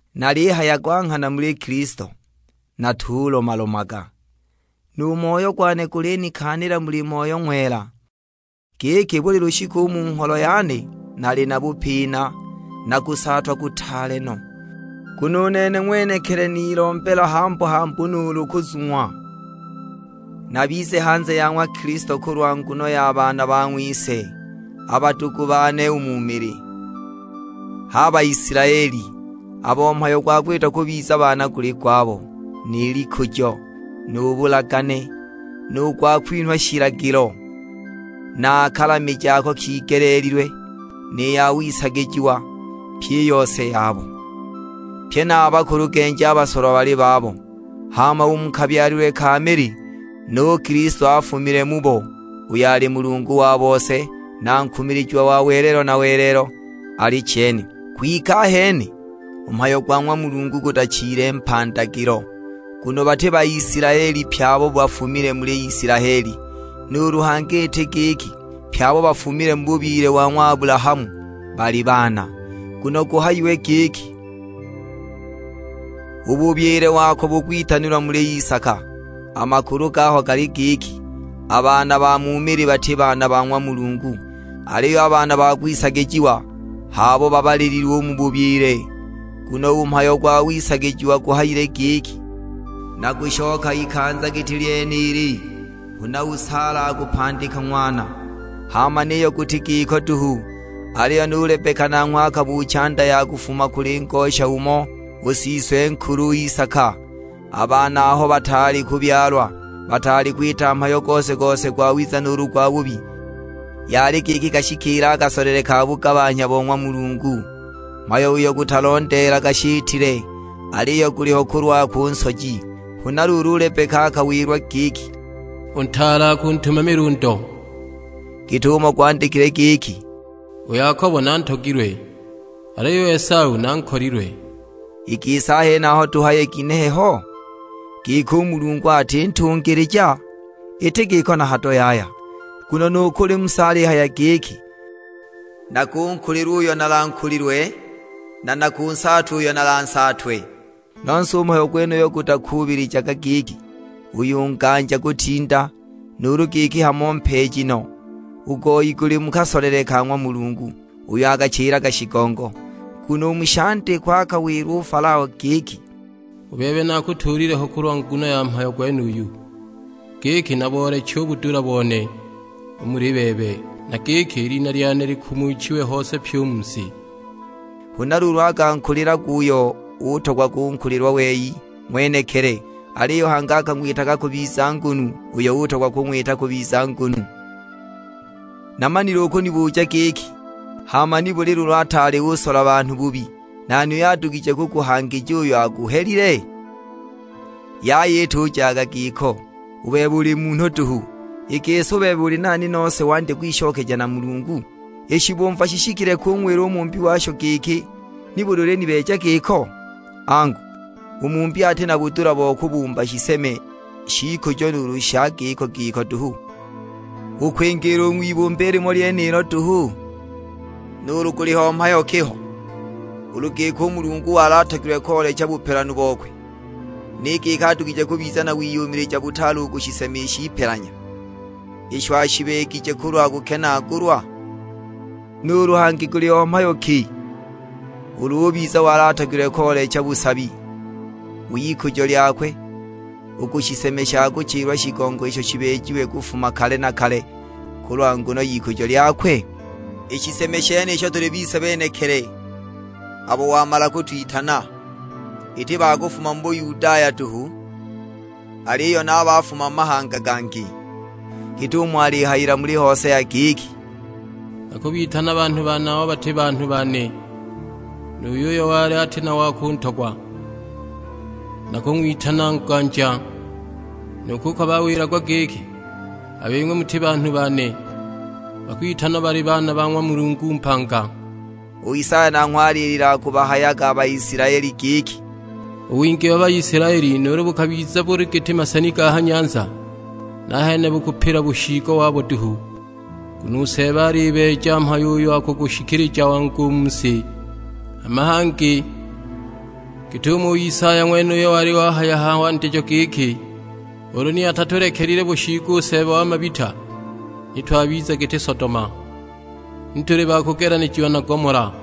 Nalihaya gwa nghana muli Kilisto, natulomalomaga; nu moyo gwane gulinikaanila muli Moyo Ng'wela, giki buli lushiku u mu ngholo yane nali na bupina, na kusaatwa kutaale no. Nguno u nene ng'wenekili ni nilombela hambu-hambu nuulu kuzung'wa, nabize hanze ya ng'wa Kilisto kulwa nguno ya baana ba ng'wise, a badugu bane u mu mili; h'a Baisilaeli, abo mhayo gwa kwitwa kubiza baana guli gwabo, ni likujo, nu bulagane, nu gwa kwinhwa shilagilo, na a kalamije ako kigeleelilwe, ni ya wisagijiwa; pyi i yose yabo. Pye na a bakulugenji a basolwa bali babo, hama u mu kabyalilwe ka mili, nu Kilisto afumile mubo; uyo ali Mulungu wa bose, na nkumilijiwa wa welelo na welelo: Alichene. Kwike ahene u mhayo gwa ng'wa Mulungu gutachile mpandagilo, nguno bati Baisilaeli pye abo bafumile muli Isilaeli. Nuulu hangi iti giki pye abo bafumile mu bubyile wa ng'wa Abulahamu bali baana; nguno guhayiwe giki, "U bubyile wako bukwitanilwa muli Isaka." A makulu gaho gali giki, a baana ba mu mili bati baana ba ng'wa Mulungu, aliyo a baana ba kwisagijiwa h'abo babalililwe u mu bubyile. Nguno u mhayo gwa wisagija guhayile giki, "Nakushoka ikanza giti lyenili, huna u Saala akupandika ng'wana." Hama niyo guti giko duhu, aliyo nu Lebeka nanghwe akabuucha nda ya kufuma kuli ngosha umo, u siswe-nkulu u Isaka. A baana aho bataali kubyalwa, bataali kwita mhayo gose-gose gwawiza nuulu gwabubi, yali giki kashikiile a kasolele ka bugabanhya bo ng'wa Mulungu; mhayo uyo gutalondeelaga shitile, aliyo guliho kulwakwe u Nsoji. Huna luulu u Lebeka akawilwa giki, "U ntaale akuntumamila u ndo." Git'umo gwandikilwe giki, "U Yakobo nantogilwe, aliyo u Esau nankolilwe." I gisi a henaho tuhaye ginehe ho? Giki u Mulungu ati ntungilija? Iti giko na hado yaya. Nguno nu kuli Musa alihaya giki, "Nakunkulilwa uyo nalankulilwe, na nakunsaatwa uyo nalansaatwe." Nose u mhayo gwenuyu gutakuubilijaga giki uyu nganja kutinda, nuulu giki hamo mpeeji no; u goi guli mu kasolele ka ng'wa Mulungu, uyo akachilaga shigongo. Nguno u mu shandikwa akawilwa u Falao giki, "U bebe nakutuulile ho kulwa nguno ya mhayo gwenuyu, giki nabooleche u budula bone u muli bebe, na giki i lina lyane likumuchiwe hose pyi u mu si." Huna luulu akankulilagwa uyo utogwa kunkulilwa wei ng'wenekili, aliyo hangi akang'witaga kubiza ngunu uyo utogwa kung'wita kubiza ngunu. Namanile ukunibuja giki, "Hama nibuli luulu ataali usola banhu bubi, nani uyo adugije kuguhangija uyo aguhelile?" Yaya itujaga giko! U bebe uli munhu duhu; i gisi u bebe uli nani nose wandye kwishokeja na Mulungu? I shibumva shishikile kung'wila u mumbi washo giki, "Nibuli ulinibeeja giko?" Angu, u mumbi ati na budula bo kubumba shiseme sh'ikujo nuulu sha giko-giko duhu, u kwingiila u ng'wibumba i limo lyenilo duhu? Nuulu guliho mhayo ki ho, ulu giki u Mulungu wali atogilwe koolecha bupelanu bokwe, ni giki adugije kubiza na wiyumilija butaale u ku shiseme sh'ipelanya, isho ashibeegije kulwa kukenaagulwa? Nuulu hangi guliho mhayo ki ulu ubiza wali atogilwe koolecha busabi w'ikujo lyakwe, u ku shiseme sha kuchilwa shigongo isho shibeejiwe kufuma kale na kale kulwa nguno y'ikujo lyakwe? I shiseme shenisho tuli bise benekili, abo wamala kutwitana; iti ba kufuma mu Bayudaya duhu, aliyo na a ba kufuma mu mahanga gangi. Git'umo alihayila muli Hosea giki, "Nakubitana banhu bane abo bati banhu bane, nu yuyo wali ati na wa kuntogwa nakung'witana nganja. Nu kuko bawilagwa giki, 'A bing'we muti banhu bane,' bakwitanwa bali baana ba ng'wa Mulungu mpanga." U Isaya nanghwe alilila akubahayaga a Baisilaeli giki, "U wingi wa Baisilaeli nuulu bukabiza buli giti maseni ga ha nyanza, nahene bukupila bushiigo wabo duhu! Nguno u Seeba alibeeja mhayo uyo akugushikilija wangu u mu si." Hama na hangi git'umo u Isaya ng'wenuyo wali wahaya a ha wandijo giki, "Ulu ni atatulekelile bushiigo u Seeba wa mabita, ni twabiza giti Sodoma, ni tuli ba kugelanijiwa na Gomola!"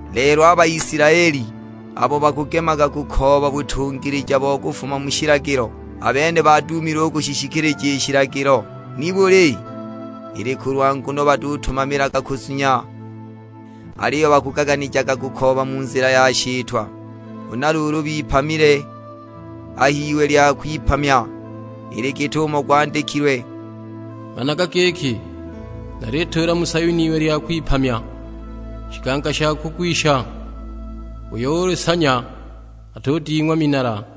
Lelo a Baisilaeli abo bakugemaga kukooba butungilija bo kufuma mu shilagilo, a bene baduumile u kushishikilija i shilagilo. Nibuli? Ili kulwa nguno batutumamilaga kuzunya, aliyo bakugaganijaga kukooba mu nzila ya shitwa; huna luulu bipamile a h'iwe lya kwipamya. Ili git'umo gwandikilwe, "Managa giki, nalituula mu Sayuni iwe lya kwipamya; shiganga sha kugwisha, uyo ulisanya atuding'wa minala."